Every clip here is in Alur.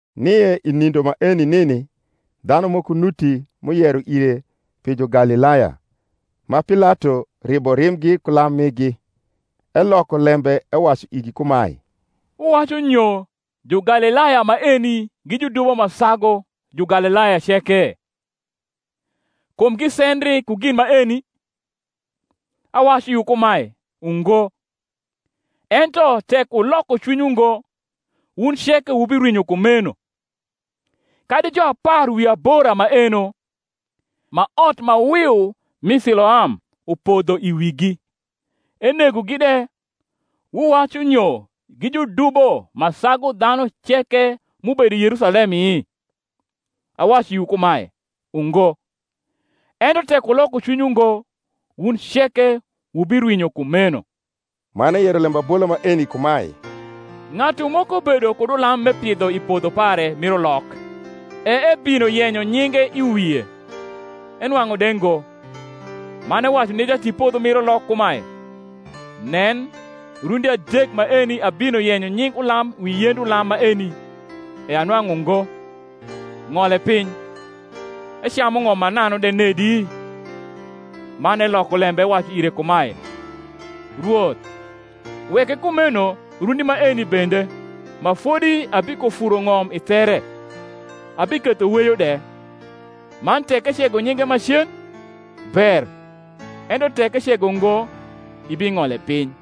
Nie i nindo maeni nini dhanu moko nuti m’uyero ire pi Jugalilaya, ma Pilato ribo rimbgi ku lam migi. Eloko lembe ewacu igi kumae, Wuwacu nyo Jugalilaya maeni gi judubo ma sagu Jugalilaya ceke? kum gisendri ku gin maeni? Awacu iwu kumae, Ungo: ento, tek wuloko cwinywu ngo, wun ceke wubirwinyo kumeno. Kadi juapar wi abora maeno, ma ot ma wiu m’i Siloam upodho i wigi, enegogi de, wuwacu nyo gi judubo ma sagu dhanu ceke m’ubedo i Yerusalemi? Awacu iwu kumae, Ungo: ento, tek wuloko cwinywu ngo, wun ceke wubirwinyo kumeno. Man eyero lembabola maeni kumae; Ng’atu moko bedo kud ulam m’epidho i podho pare mir ulok; e ebino yenyo nyinge i wie, enwang’u de ngo. Man ewacu ni jatipodho mir ulok kumae, Nen, rundi adek maeni abino yenyo nying ulam wi yend ulam maeni, e anwang’u ngo; ng’ole piny; ecamu ng’om mananu de nedi? Man eloko lembe ewacu ire kumae, Rwoth, weke kumeno rundi maeni bende, ma fodi abikofuro ng’om i there, abiketho weyo de: man tek ecego nyinge macen, ber; ento tek ecego ngo, ibing’ole piny.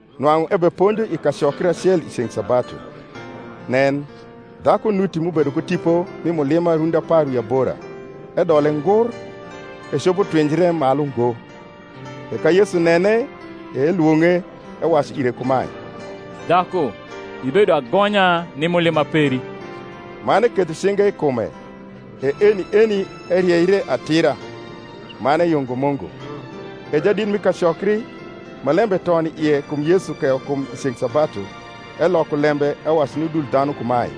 Nwang’u ebeponjo i kacokri acel i ceng’ sabatu. Nen, dhaku nuti m’ubedo ku tipo mi mulima rundi apar wi abora; edole ngur, ecopo twinjre malu ngo. E ka Yesu nene, e elwong’e, ewacu ire kumae, Dhaku, ibedo agonya ni mulima peri. Man eketho cinge i kume: e eni eni erieire atira, man eyungo Mungu. E jadit mi kacokri, ma lembe ton i ie kum Yesu keyo kum i ceng’ sabatu, eloko lembe ewacu ni udul dhanu kumae,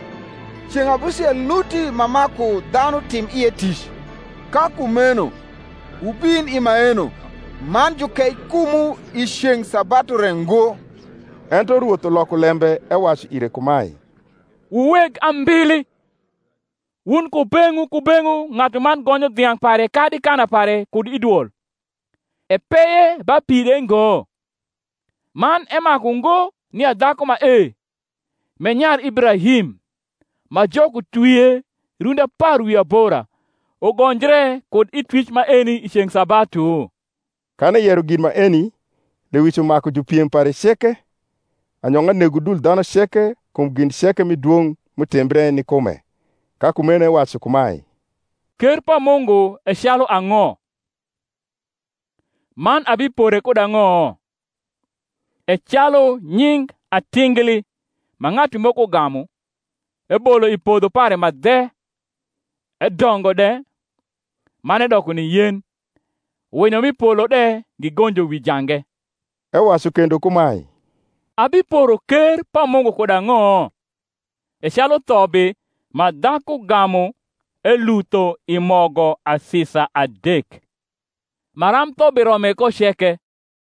Ceng’ abusiel nuti ma maku dhanu tim ie tic: ka kumeno wubin i maeno man jukei kumwu, i ceng’ sabatu re ngo. Ento Rwoth uloko lembe ewacu ire kumae, Wu weg ambili, wun kubeng’wu kubeng’wu ng’atuman gonyo dhiang’ pare kadi kana pare kud i dwol, epeye ba pi de ngo? Man emaku ngo nia dhaku mae, m’e nyar Ibrahim, ma Jok utwvie, rundi apar wi abora, ugonjre kud i twic maeni i ceng’ sabatu? Kan eyero gin maeni, lewic umaku jupiem pare ceke: anyong’a nego udul dhanu ceke kum gin ceke mi dwong’ m’utimbre ni kume. Ka kumeno ewacu kumae, Ker pa Mungu e calu ang’o? man abipore kud ang’o? E calu nying atingli, ma ng’atu moko gamu, ebolo i podho pare ma dhe; edongo de, man edoko ni yen; winyo m’i polo de gigonjo wi jange. Ewacu kendo kumae, Abiporo ker pa Mungu kud ang’o? E calu thobi, ma dhaku gamu elutho i mogo asisa adek, maram thobi rome ko ceke.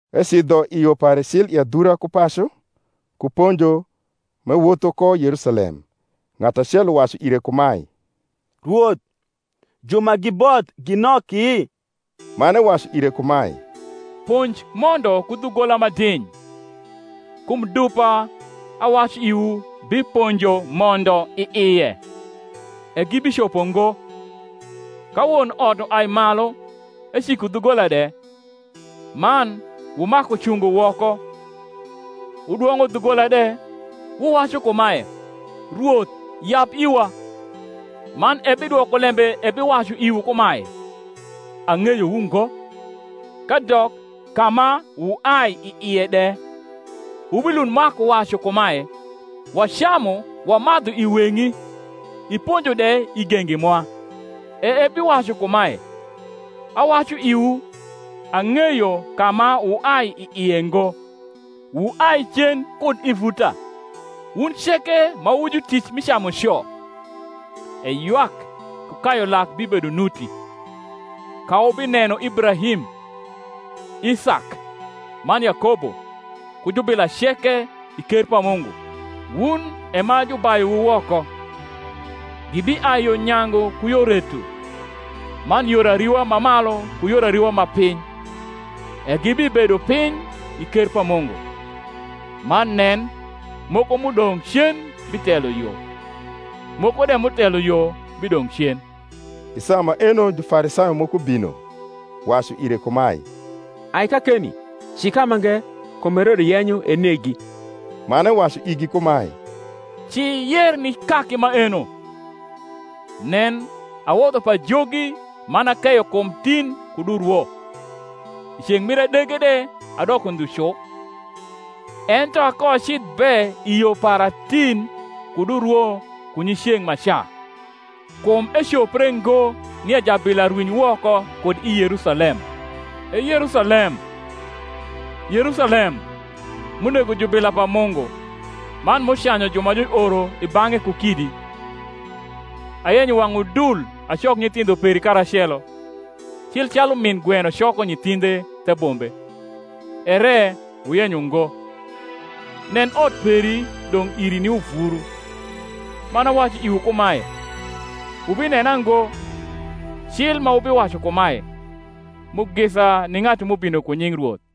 Ecidho i yo pare cil i adhura ku pacu, ku ponjo, m’ewotho ko Yerusalem. Ng’atu acel uwacu ire kumae, Rwoth, ju ma giboth gi noki? man ewacu ire kumae, Ponj mondo ku dhugola ma diny: kum dupa, awacu iwu, biponjo mondo i ie, e gibicopo ngo, ka won ot uai malu, eciko dhugola de, man wumaku cungo woko, wudwong’o dhugola de, wuwacu kumae, Rwoth, yab iwa; man ebidwoko lembe ebiwacu iwu kumae, Ang’eyowu ngo kadok ka ma wuai i ie de; wubilund maku wacu kumae, Wacamu wamadhu i weng’i, iponjo de i gengi mwa; e ebiwacu kumae, Awacu iwu, Ang’eyo ka ma wuai i ie ngo; wuai cen kud i vuta, wun ceke ma wu jutic mi camuco. E ywak ku kayu lak bibedo nuti, ka wubineno Ibrahim, Isak, man Yakobo, ku jubila ceke, i ker pa Mungu, wun e ma jubayuwu woko. Gibiai yo nyangu ku yo reto, man yor ariwa ma malu ku yor ariwa ma piny, e gibibedo piny i ker pa Mungu. Man nen, moko m’udong’ cen bitelo yo, moko de m’utelo yo bidong’ cen. I saa maeno Jufarisayo moko bino, wacu ire kumae, Ai kakeni, ci kamange: kum Herode yenyo enegi. Man ewacu igi kumae, Ci yer ni kaki maeno, Nen, awodho pajogi man akeyo kum tin kud urwo, i ceng’ mir adege de adoko ndhu cu. Ento akoacidh be i yo para tin kud urwo ku nyiceng’maca: kum ecopre ngo nia jabila rwiny woko kud i Yerusalem. E Yerusalem, Yerusalem, m’unego jubila pa Mungu, man m’ucanyu ju ma juoro i bang’e ku kidi! ayenyo wang’ udul acok nyithindho peri karacelo, cil calu min gweno coko nyithindhe the bombe, ere wuyenyo ngo! Nen, ot peri dong’ iri ni uvuru: man awacu iwu kumae, Wubinena ngo, cil ma wubiwacu kumae, Mugisa ni ng’atu m’ubino ku nying Rwoth.